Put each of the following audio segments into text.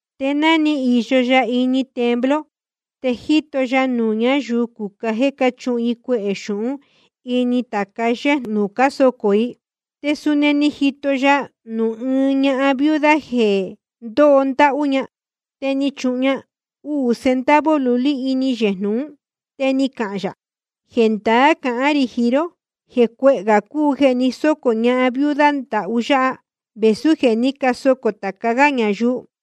Te ná ni īyo ya ini templo, te jíto ya nuū ñáyuu cucá jéē cáchuhun i cuehē xūhún ini tāca yéjnū nuū cásocō i. Te suni ni jito ya nuū ɨɨn ñahan viuda jeē ndóho ndáhú, te ni chuhun ña uū centavo lulí ini yejnū ún. Te ni cahān yā: Jendaá cahán rī jiín ró jeē cuehē gā cúu jeē ni sócō ñahan viuda ndahú yáha, vēsú jeē ní casocō tāca gá ñayuu.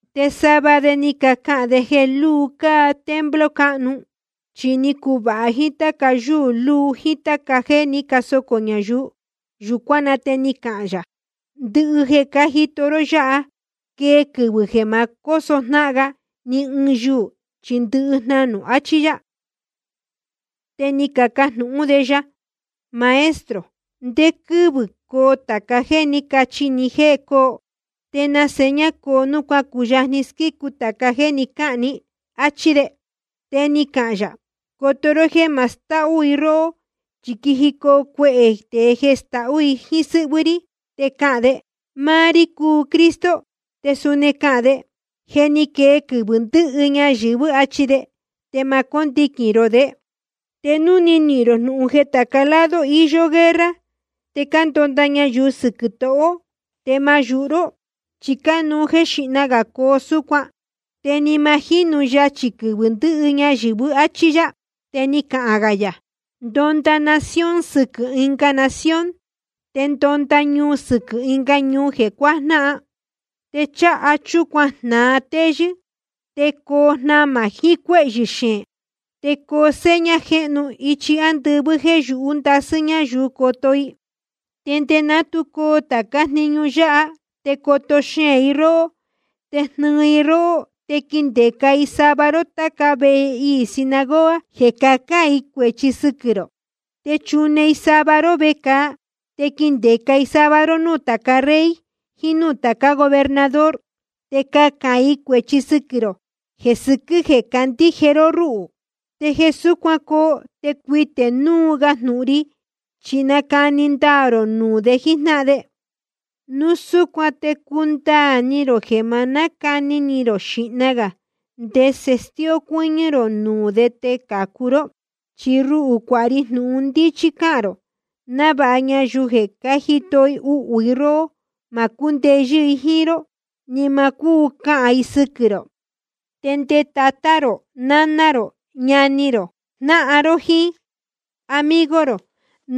Te sava de ni cacahān de jeē luu cáa templo cáhnu, chi ni cuvāha jíín táca yúū luu jíín táca jéē ní casocō ñayuu. Yūcuán na te ni cahān yā: Ndɨhɨ jeē cájito ró yáha, quee quɨvɨ̄ jeē ma cóso jnáhan ga ni ɨɨn yuū, chi ndɨhɨ jnanū, achí yá. Te ni cacajnūhún de ya: Maestro, ¿ndé quɨ́vɨ̄ coo tāca jéē ní cachi ní jéē coo? ¿Te na seña coo nuū cuácuyajni squícu tāca jéē ni cáhān ní? áchí de. Te ni cahān yā: Coto ró jéē ma stahú i róhó. Chi quijicoo cuehē tēe jeē stahú jíín sɨ́hvɨ́ rí, te cahān de: Máá rí cúu Cristo. Te suni cahān de: Je ni quee quɨvɨ̄ ndɨhɨ ñayɨ̄vɨ́, achi de. Te ma cóndiquīn rō de. Te núu nihīn rō jnūhun jeē tāca lado iyó guerra te cándonda ñayuu sɨquɨ̄ tohō, te ma yūhu ró, chi cánuú jéē xíhna gā coo súcuan, te ni ma jinú yachī quɨvɨ̄ ndɨhɨ ñayɨ̄vɨ́. Achí yá. Te ni cahān gā yā: Ndonda nación sɨquɨ̄ ɨnga nación, te ndonda ñuu sɨquɨ̄ ɨnga ñuu jeē cuajnáhan. Te cháha chúcuan jnāa téyɨ́, te coo jnamā jiín cuéhyɨ̄ xeēn. Te coo seña jéhnu ichi ándɨvɨ́ jéē yūhú ndasɨ́ ñáyuu coto i. ’Te nde ná tu coo tācá jniñu yáha, te coto xeēn i róhó, te jnɨɨ i róhó. Te quindeca i sava ró táca vehe iī sinagoga jeē cahán i cuēchi sɨquɨ̄ rō. Te chune i sava ró vecāa. Te quindeca i sava ró núū tāca rey jiín núū tācá gobernador, te cahān i cuēchi sɨquɨ̄ rō jeē sɨquɨ́ jeē cácandíje ró rúhū. Te jeē súcuan coo, te cuitē núu ga jnūhun ri, chi nacani ndaā rō nuū de jíjnáhan de. Núu súcuan te cundaā ni rō jeē ma nácani ni rō xīhna gā ndese stíó cuɨ́ñɨ́ rō nuū de te cācu ró. Chi ruhū cuāha ri jnūhun ndíchí cahān rō, návāha ñayuu jeē cájito uhū rohó, ma cúndeyɨ́ i jíín ró ni ma cúu cahān i sɨquɨ̄ rō. Te nde tatá rō, naná rō, ñani rō, jnáhan ró, jíín amigo rō,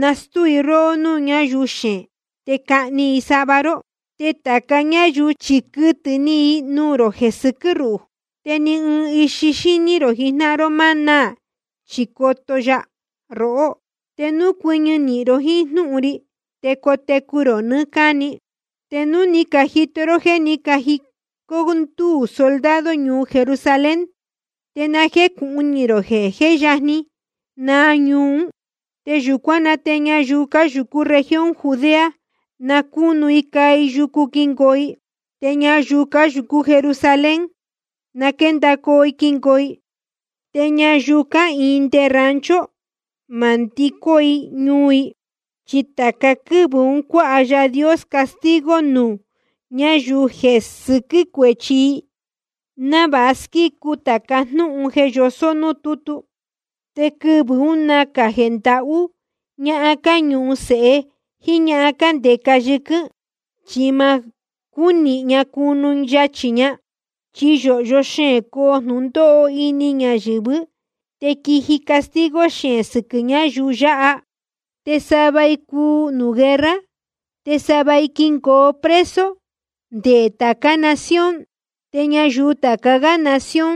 nastúu i róhó núū ñáyuu xeēn. Te cahni i sava ró. Te tāca ñáyuu chi quɨtɨ̄ ni i nuū rō jeē sɨquɨ́ ruhū. Te ni ɨɨn ixi xíní rō jijnáhan ró ma náā, chi coto ya rohó. Te núu cuɨñɨ nīhin ró jíín jnúhun ri, te cotecu rō nɨɨ́ cáni. ’Te núu ni cajito ró jéē ní cajicó ndúū soldado ñuu Jerusalén, te na jécūhun ni rō jeē jé yajni naa ñuu ún. Yūcuán na te ñayuu cáyūcú región Judea, na cúnu i caa i yucu quingoo i. Te ñayuu cáyūcú Jerusalén, na quéndacoo i quingoo i. Te ñayuu cáhīin nde rancho, ma nándicó i ñuu ún. Chi tāca quɨ́vɨ̄ un cuáha Yaā Dios castigo nuū ñáyuu jeē sɨquɨ́ cuéchi i, návāha squícu tāca jnúhun jeē yosó núū tútu. Te quɨvɨ̄ ún nacā jeē ndahú ñahan cáñuhun sēhe jíín ñahan cándeca yɨquɨ́n, chi ma cúnihīn ña cunu yachī ña. Chi yōhyo xeēn coo jnūndóho ini ñayɨ̄vɨ́, te quiji castigo xeēn sɨquɨ̄ ñáyuu yáha. Te sava i cuu nuū guerra, te sava i quingoo preso nde tācá ɨnga nación. Te ñayuu tāca gá nación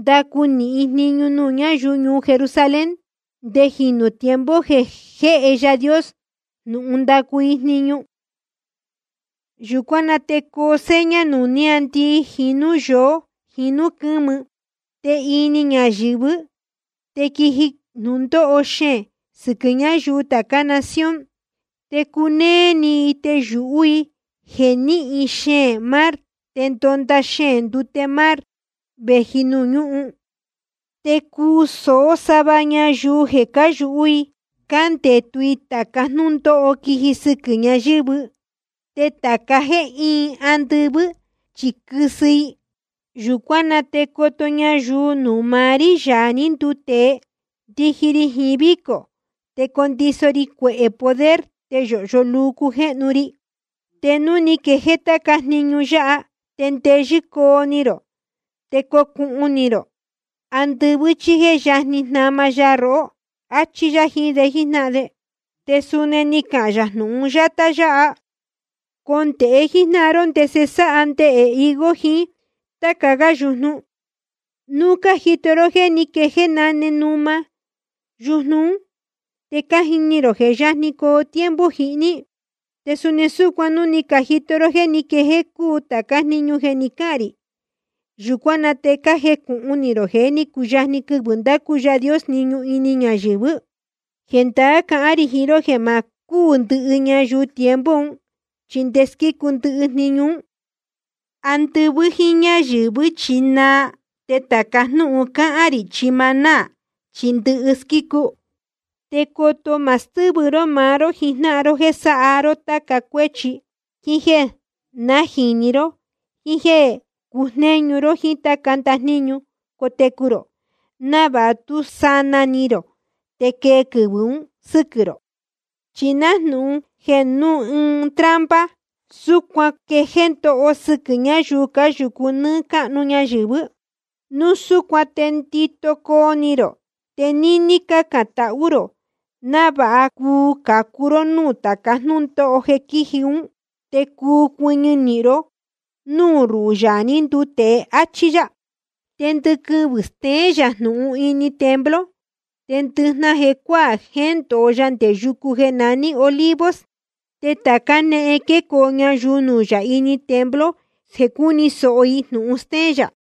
ndacu nīhin i jniñu nuū ñáyuu ñuu Jerusalén, nde jīnu tiempo jeē jéhe Yaā Dios jnūhun ndacu i jniñu. ’Yūcuán na te coo seña nuū níāndii jíín núū yoó jiín núū quɨ́mɨ. Te ini ñayɨ̄vɨ́ te quiji jnūndóho xeēn sɨquɨ̄ ñáyuu tācá nación. Te cunéé ni i, te yūhú i jeē nɨ́hɨn xeēn mar te ndónda xeēn ndute mar vēji nuū ñúhun. Te cuu sōó sava ñayuu jeē cáyūhú i cándetu i tāca jnúndóho quiji sɨquɨ̄ ñayɨ̄vɨ́. Te tāca jéē íin andɨvɨ́ chi quɨsɨ i. Yūcuán na te coto ñayuu nuū maá rí, Yaā ní nduu tēe, ndiji ri jiín vícō, te condiso ri cuehē poder, te yōhyo luu cujéhnu ri. Te núu ni quejéé táca jniñu yáha, te ndeyɨ́ coo ni rō, te cocunuū rō andɨvɨ́, chi je yajni jnama ya rohó. Achí yá jiín de jíjnáhan de. Te suni ni cahān yā jnūhun yátá yáha: Condēhe jíjnáhan ró ndese sáha nundēhe higo jiín táca gá yujnu. Núu cájito ró jéē ní quejéé náne numa yújnu ún, te cájini rō jeē jé yajni coo tiempo jihní. Te suni súcuan núu ni cajito ró jéē ní quejéé cúu tācá jniñu jeē ni cáhān rī, yūcuán na te na jécūhun ni rō jeē ní cuyajni quɨvɨ̄ ndacu Yaā Dios jniñu ini ñayɨ̄vɨ́. ’Jendaá cahán rī jiín ró jeē ma cúū ndɨhɨ ñayuu tiempo un, chi nde squícu ndɨhɨ jniñu ún. Andɨvɨ́ jíín ñáyɨ̄vɨ́ chi naa, te tāca jnúhun cáhán rī chi ma náā, chi ndɨhɨ squícu. ’Te coto ma stɨ́vɨ ró maá ró jijnáhan ró jéē sáha ró táca cuéchi, jíín jéē najīni ró, jíín jéē cujnéñu ró jíín táca ndajníñu cotecu rō, návāha tú sanaa ni rō te quee quɨvɨ̄ un sɨ́quɨ̄ rō. Chi nájnūhun jeē núu ɨɨn trampa, súcuan quee jnūndóho sɨquɨ̄ ñáyuu cáyūcu nɨ́ɨ́ cáhnu ñayɨ̄vɨ́. Núu súcuan te ndito coo ni rō, te níní cácān tahú rō, návāha cuu cācu ró núū tāca jnúndóho jeē quíji ún, te cuu cuɨñɨ ró núū ruhū, Yaā ní nduu tēe. Achí yá. Te ndɨquɨvɨ̄ steén yā jnūhun ini templo, te ndɨjnahan jecuáā jéndōo ya nde yucu jeē naní Olivos. Te tāca jénéhen quécoo ñayuu nuū yā ini templo jeē cúni sōho i jnūhun stéén yā.